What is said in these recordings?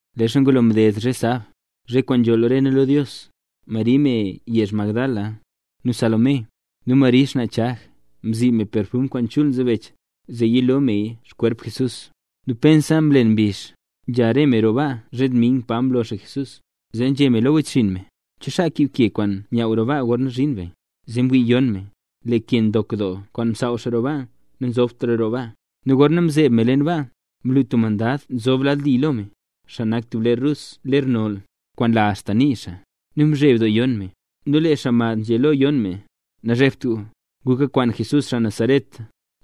Leezha ngulo mded zhe sab, zhe kwaan nzholl re nu lo Dios, Mari me yezh Magdala, nu Salomé, nu Mari xnaa Chag, mzi me perfum kwaan chul nzebech, zee yilo meya xkwerp Jesús. Nu pensa mlen mbizh, nzha re me roo baa zhe dming, pa mlo xaa Jesús. Zee nzhé me lo wechxinn me: —¿Cho xaa kiib ke kwaan nyaaw roo baa gorna zhin be? Zee mwii yon me, lee ke ndok doo kwaan msaaw xaa roo baa, nazobtraya roo baa. Nu gorna mzeeb me leen baa, mlu tub xaa mad nzob lad li lo me, xaa nak tub ler rus ler noll, kwaan nla axta nii xaa. Nu mzheb doo yon me. Nu lee xaa mad nzhé lo yon me: —Nazhebt gu. Gu kakwaan Jesús xaa Nazaret,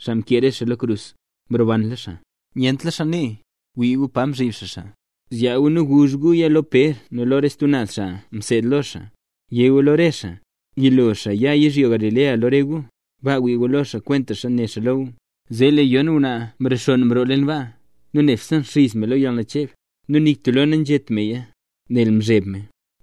xaa mkee re xaa lo krus. ¡Mrobanla xaa! ¡Nyentla xaa nee! Wii gu pa mzhib xaa xaa. Zyaa gu nu guzh guya lo Pér nu lo re stub naz xaa mseed lo xaa. Yé gu lo re xaa: “Yilo xaa ya yizhyo Galilea lo re gu. Baa wii gu lo xaa, kwentaxa né xaa lo gu”. Zee lee yon ngwnaa mrexonn mroo leen baa, nu nebse nxiz me lo yalnacheb. Nu nik tub lo nanzhét meya, nel mzheb me.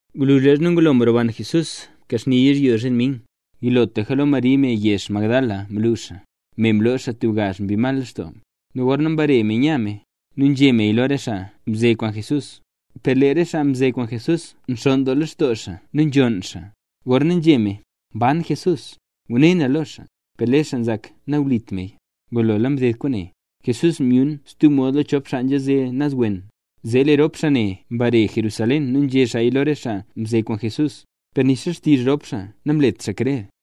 Gwluzh leezha ngulo mroban Jesús mkaxni yizhyo zhe dming, yilotlaka lo Mari, me yezh Magdala, mlu xaa, me mloo xaa tub gazh mbi mal lextoo. Nu gorna mbare me nya me, nu nzhé meya lo re xaa mze kwaan Jesús. Per lee re xaa mze kwaan Jesús nxonn doo lextoo xaa nu nzhonn xaa. Gorna nzhé me: “Mban Jesús, ngune na lo xaa”, per lee re xaa nzak nawlit meya. Ngulo mded kwaane, Jesús myun stub mod lo chop xaa nzha naz wen. Zee lee rop xaa ne mbare Jerusalén nu nzhé xaaya lo re xaa mze kwaan Jesús, per nixa xtizh rop xaa ne namlet xaa krer.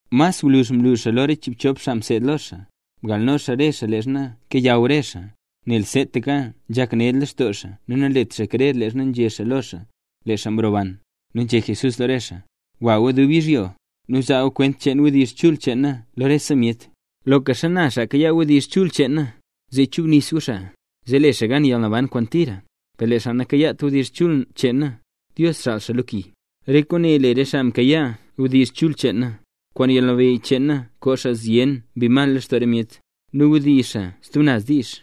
Mas gwluzh mlu xaa lo re chiibtub xaa mseed lo xaa. Mgalno xaa re xaa leezha kayaw re xaa, nel seetaka nzhak ned lextoo xaa nu nanlet xaa krer leezha nzhé xaa lo xaa, lee xaa roban. Nu nzhé Jesús lo re xaa: —Gwa gu dubse yizhyo, nu zaa gu kwent cheen wdizh chul cheen na lo rese myet. Loka xana xaa mkayaa wdizh chul cheen na, zee chubnis gu xaa, zee le xaa gan yalnaban kwaan tira. Per lee xaa nakayaat wdizh chul cheen na, Dios xaal xaa lo ki. Re kwaane le re xaa mkayaa wdizh chul cheen na: kwaan yalnabeyy cheen na koo xaa zyen mbi mal lextoo re myet, nu wdizh xaa stub naz diizh,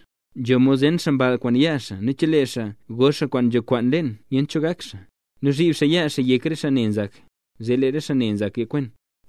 nzho mod zen xaa mball kwaan yaa xaa, nu chelee xaa go xaa kwaan nzho kwaan leen nyent cho gak xaa, nu zhib xaa yaa xaa yek re xaa ne nzak, zee lee re xaa ne nzak yakwen.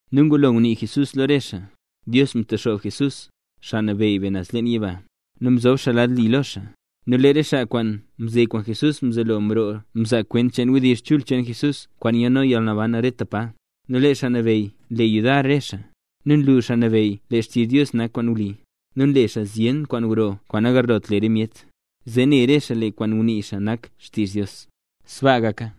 Nu ngulo ngunii Jesús lo re xaa, Dios mtexoob Jesús, Xaa Nabeyy be, naz leen yiba, nu mzob xaa xaa lad li lo xaa. Nu lee re xaa kwaan mze kwaan Jesús mzelo mroo mzaa kwent cheen wdizh chul cheen Jesús kwaan nyalno yalnaban rete pa. Nu lee Xaa Nabeyy nle yudar re xaa. Nu nlu Xaa Nabeyy lee xtizh Dios nak kwaan wli, nu nle xaa zyen doo kwaan gro kwaan nagarlot le re myet, zee ne re xaa lee kwaan ngunii xaa nak xtizh Dios. ¡Sbaa gaka!